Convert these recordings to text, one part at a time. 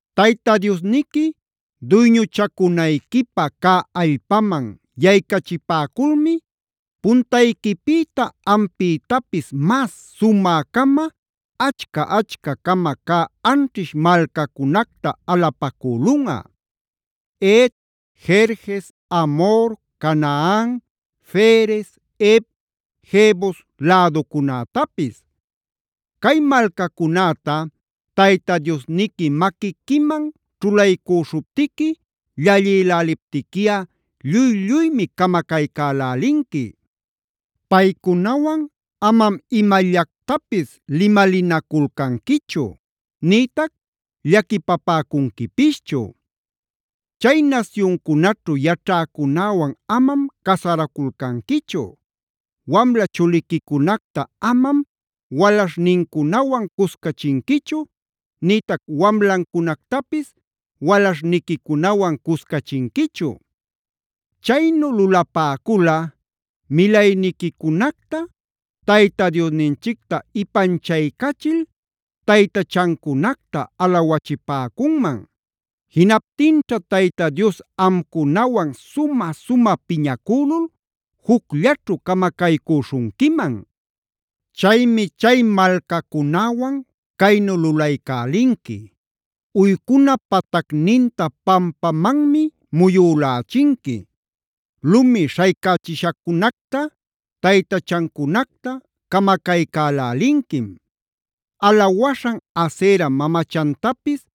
“Tayta Diosniqui duyñuchacunayquipä cä allpaman yaycachipäculmi puntayquipïta ampïtapis mas sumä-cama, achca-achca-cama cä anćhish malcacunacta alapacülunꞌa:a Het, Gerges, Amhor, Canaan, Ferez, Hev, Jebus läducunätapis. Cay malcacunäta Tayta Diosniqui maquiquiman ćhulaycüśhuptiqui llalliläliptiquiꞌa lluy-lluymi camacaycälälinqui. Paycunawan amam imallactapis limalinaculcanquichu, nïtac llaquipapäcunquipischu. Chay nasyuncunaćhu yaćhäcunäwan amam casaraculcanquichu. Wamla chuliquicunacta amam walaśhnincunawan cuscachinquichu, nïtac wamlancunactapis walaśhniquicunawan cuscachinquichu. Chaynu lulapäculꞌa milayniquicunacta Tayta Diosninchicta ipanchaycachil taytachancunacta alawachipäcunman. Jinaptinćha Tayta Dios amcunawan sumä-sumä piñacülul jucllaćhu camacaycüśhunquiman. Chaymi chay malcacunäwan caynu lulaycälinqui: uycuna patacninta pampamanmi muyülächinqui, lumi śhaycächishacunacta, taytachancunacta camacaycälälinquim; alawaśhan Asera mamachantapis,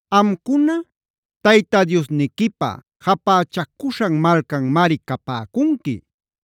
Amcuna Tayta Diosniquipä japächacuśhan malcanmari capäcunqui.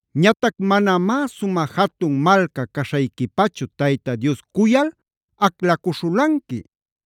“Ñatac manamá sumä jatun malca caśhayquipachu Tayta Dios cuyal aclacuśhulanqui.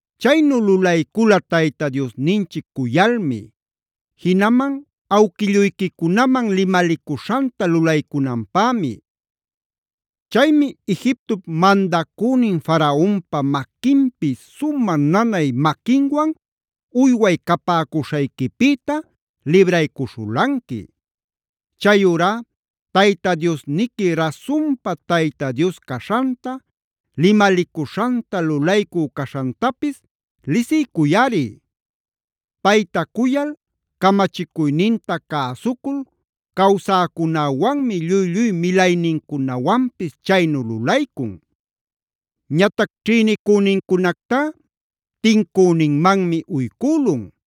Chaynu lulaycula Tayta Diosninchic cuyalmi; jinaman awquilluyquicunaman limalicuśhanta lulaycunanpämi. Chaymi Egiptop mandacünin Faraonpa maquinpi sumä nanay maquinwan uyway capäcuśhayquipïta libraycuśhulanqui. Chayurá Tayta Diosniqui rasunpa Tayta Dios caśhanta, limalicuśhanta lulaycü caśhantapis lisiycuyꞌari. Payta cuyal camachicuyninta cäsucul cawsäcunäwanmi lluy-lluy milaynincunawanpis chaynu lulaycun. Ñatac ćhïnicünincunactá tincüninmanmi uycülun.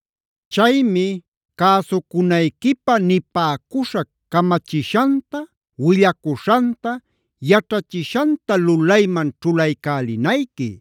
Chaymi cäsucunayquipä nipäcuśhac camachishanta, willacuśhanta, yaćhachishanta lulayman ćhulaycälinayqui.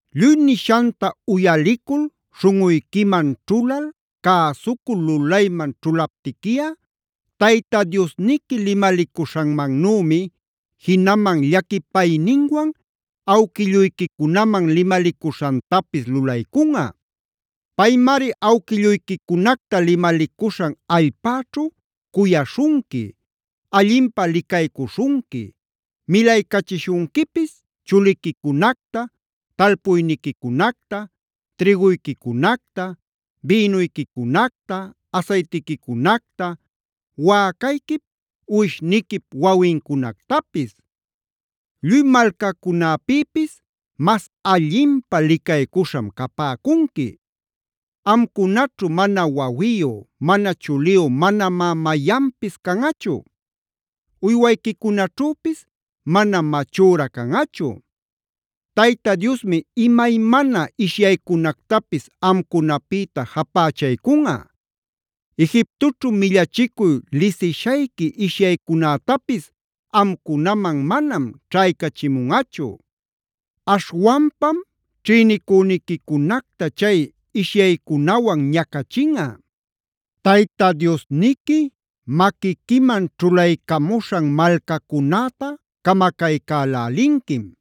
“Lluy nishanta uyalicul śhunꞌuyquiman ćhulal, cäsucul lulayman ćhulaptiquiꞌa Tayta Diosniqui limalicuśhanmannümi, jinaman llaquipayninwan awquilluyquicunaman limalicuśhantapis lulaycunꞌa. Paymari awquilluyquicunacta limalicuśhan allpäćhu cuyaśhunqui, allinpä licaycuśhunqui, milaycachishunquipis chuliquicunacta talpuyniquicunacta, trïguyquicunacta, bïnuyquicunacta, asaytiquicunacta, wäcayquip uwishniquip wawincunactapis. Lluy malcacunäpïpis mas allinpä licaycuśham capäcunqui. Amcunaćhu mana wawiyu, mana chuliyu manamá mayanpis canꞌachu; uywayquicunaćhüpis manam machüra canꞌachu. Tayta Diosmi imaymana ishyaycunactapis amcunapïta japächaycunꞌa. Egiptoćhu millachicuy lisishayqui ishyaycunätapis amcunaman manam ćhaycachimunꞌachu. Aśhwanpam ćhïnicüniquicunacta chay ishyaycunawan ñacachinꞌa. Tayta Diosniqui maquiquiman ćhulaycamuśhan malcacunäta camacaycälälinquim.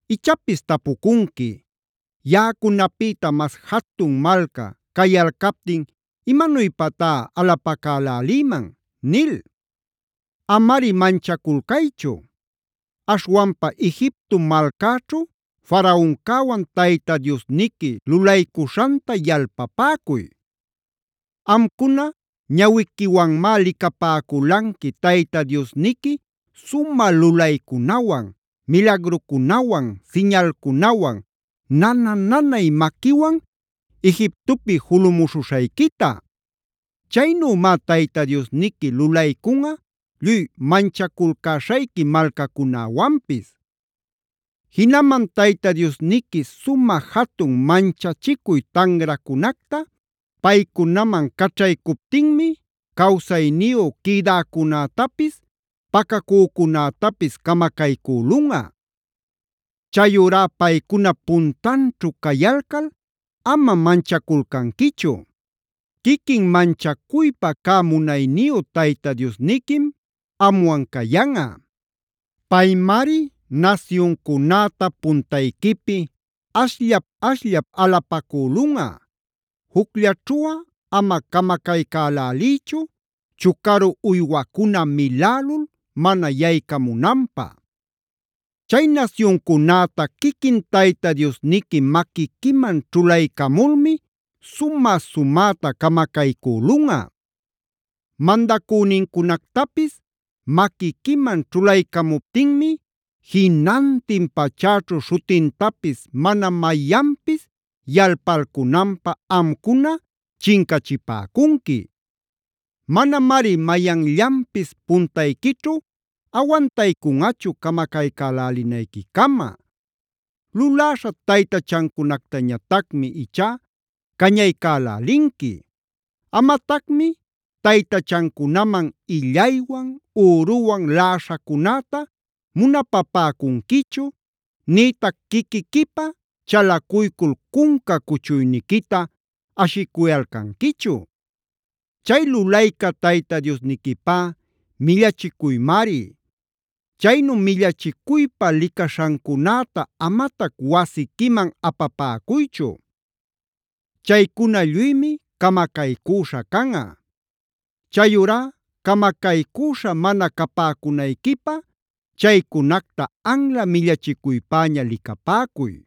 “Ichapis tapucunqui: ‘Yaꞌacunapïta mas jatun malca cayalcaptin ¿imanuypatá alapacälälïman?’ nil. Amari manchaculcaychu. Aśhwanpa Egipto malcäćhu Faraoncäwan Tayta Diosniqui lulaycuśhanta yalpapäcuy. Amcuna ñawiquiwanmi licapäculanqui Tayta Diosniqui sumä lulaycunawan, milagrucunawan, siñalcunawan, nana-nanay maquiwan Egiptopi julumuśhuśhayquita. Chaynümá Tayta Diosniqui lulaycunꞌa lluy manchaculcäśhayqui malcacunäwanpis. Jinaman Tayta Diosniqui sumä jatun manchachicuy tanracunacta paycunaman caćhaycuptinmi cawsayniyu quïdäcunätapis pacacücunätapis camacaycülunꞌa. Chayurá paycunap puntanćhu cayalcal amam manchaculcanquichu; quiquin manchacuypa cä munayniyu Tayta Diosniquim amwan cayanꞌa. Paymari nasyuncunäta puntayquipi ashllap-ashllap alapacülunꞌa. Jucllaćhuꞌa ama camacaycäläliychu, chucaru uywacuna milälul mana yaycamunanpä. Chay nasyuncunäta quiquin Tayta Diosniqui maquiquiman ćhulaycamulmi sumä-sumäta camacaycülunꞌa.g Mandacünincunactapis maquiquiman ćhulaycamuptinmi jinantin pachäćhu śhutintapis mana mayanpis yalpalcunanpä amcuna chincachipäcunqui. Manamari mayanllanpis puntayquićhu awantaycunꞌachu camacaycälälinayquicama. Luläśha taytachancunactañatacmi ichá cañaycalälinqui. Amatacmi taytachancunaman illaywan, üruwan laꞌaśhacunäta munapapäcunquichu, nïtac quiquiquipä chalacuycul cunca cuchuyniquita ashicuyalcanquichu. Chay lulayca Tayta Diosniquipá millachicuymari. Chaynu millachicuypa licaśhacunäta amatac wasiquiman apapäcuychu. Chaycuna lluymi camacaycüśha canꞌa. Chayurá camacaycüśha mana capäcunayquipä chaycunacta anla millachicuypäña licapäcuy.